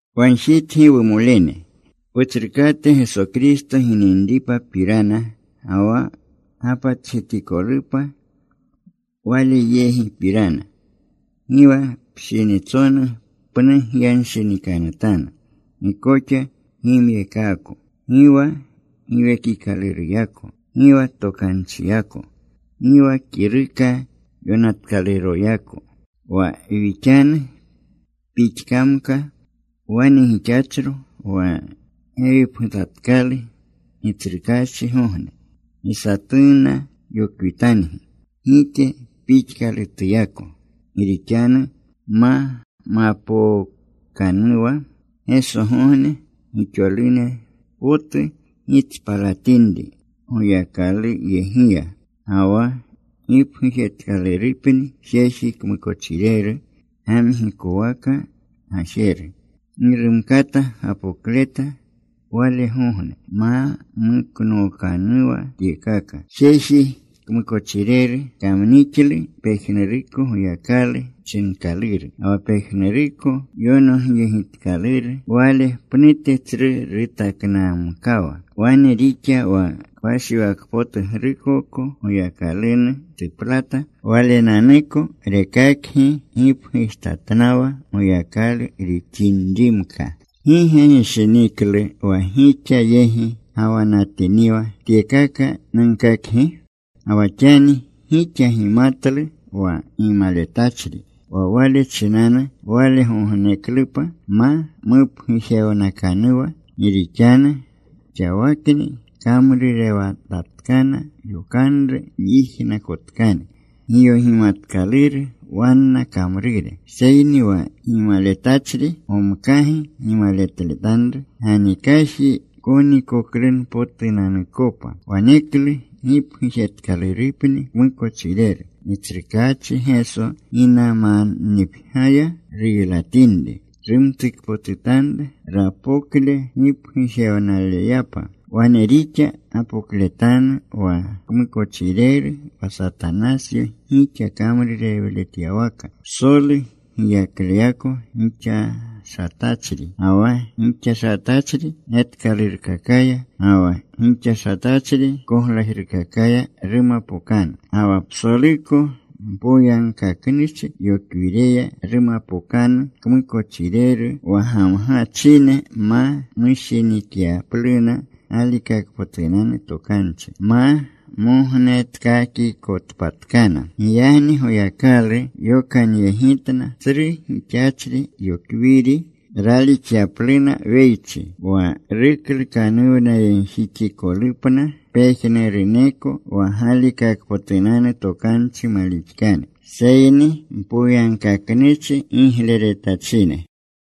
Wagjitgi, wumolene, Wutsrukate Geso Kristo gininripapirana, ga wa wapatjetikolupa Waleyegipirana: Gi wa pshinitsonu pnu gyanshinikanutanu. Gi koxa gimyeekaako, gi wa giwekikaluruyako, gi wa tokanchiyako, gi wa kiruka yonatkaluroyako, wa wixanu pixkamka, wane gixachro wa gewipgutatkalu Gitsrukaachigogne. Gi satunna yokwitangi gike pixkalutuyako. Gi rixanu ma mapookanuwa Gesogogne, gixolune potu gitspalatinri Goyakaluyegiya, ga wa gipgujetkalurupni jeji kmukochireru, gamgikowaka gajeru. Gi rumkata gapokleta walegogne ma muknookanuwa tyekaka. Jeji kmukochireru kamnixlu pejnuruko goyakalu chinkaluru ga wa pejnuruko yonogyegitkaluru. Wale pnute tsru rutaknamkawa. Wane rixa wa kpashiwakpotugrukoko Goyakalunu tuplata. Walenanuko rekaka gipgutatnawa Goyakalu rixinrimka. ¿Gi ge gishiniklu wa gixa yegi gawanatiniwa tyekaka nunkakgi? Ga wa xani gixa gimatlu wa gimaletachri, wa wale chinanu walegogneklupa ma mupgujewnakanuwa. Gi rixanu xawakni kamrurewanatatkana yokanru myijnakotkane. Giyogimatkaluru wanna kamrure. Seyni wa gimaletachri gomkagi gimaletanru, ganikaji konikoklunpotunanukopa. Waneklu gipgujetkalurupni kmukochireru. Gitsrukaachi Geso ginamannipgyaya ruylatinri. Rumtukpotutanru rapokle gipgujewnaleyapa. Wane rixa gapokletanu wa kmukochireru wa Satanasyo gixa kamrurewletyawaka. Psolu giyakleyako gixashatachri, ga wa gixashatachri getkalurkakaya, ga wa gixashatachri koglajrukakaya rumapokanu. Ga wa psoluko mpoyagkaknuchi yokwireya rumapokanu kmukochireru wa gamgachine ma mushinikyapluna galikakpotunanu tokanchi, ma mognetkakikotpatkana. Giyagni Goyakalu yokanyegitna tsru gixachri yokwiri, ralixyapluna weychi, wa ruklukanuwnayegjixikolupna pejnuruneko wa galikakpotunanu tokanchi malixkane, seyni mpoyagkaknuchi gigleretachine.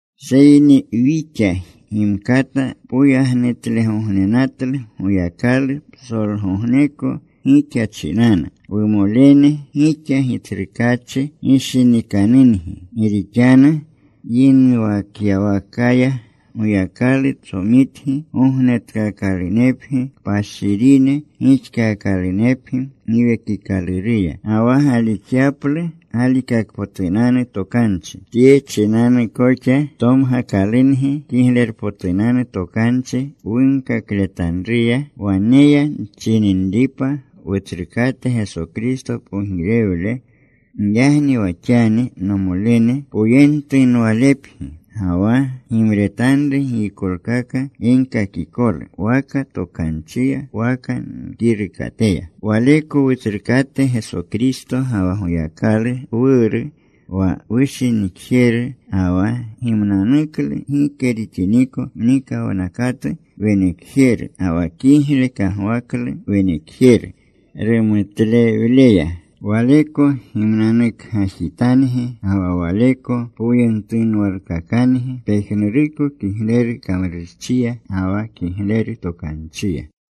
Seyni wixa gimkata poyagnutlegognenatlu Goyakalu psolgogneko gixa chinanu, wumolene. Gixa Gitsrukaachi gishinikanungi. Gi rixanu yinuwakyawakaya Goyakalu tsomitgi gognetkaakalunepgi, kpashirine gixkalunepgi Giwekikaluruya, ga wa galixyaplu galikakpotunanu tokanchi. Tye chinanu koxa tomgakalungi Kiglerpotunanu Tokanchi wunkakletanruya, waneya nchininripa Wutsrukate Geso Kristo pogirewle. Giyagni wa xani, nomolene, poyentunwalepgi. Ga wa gimretanru giykolkaka ginkakikolu, waka tokanchiya waka wkirukateya. Waleko Wutsrukate Geso Kristo ga wa Goyakalu Wuru wa wushinikjeru, ga wa gimnanuklu gike rixiniko mnikawnakatu wenekjeru, ga wa kigle kagwaklu wenekjeru rumutlewleya, Waleko gimnanukgajitangi ga wa Waleko poyentunwalkakangi pejnuruko kigleru kamrurchiya ga wa kigleru tokanchiya.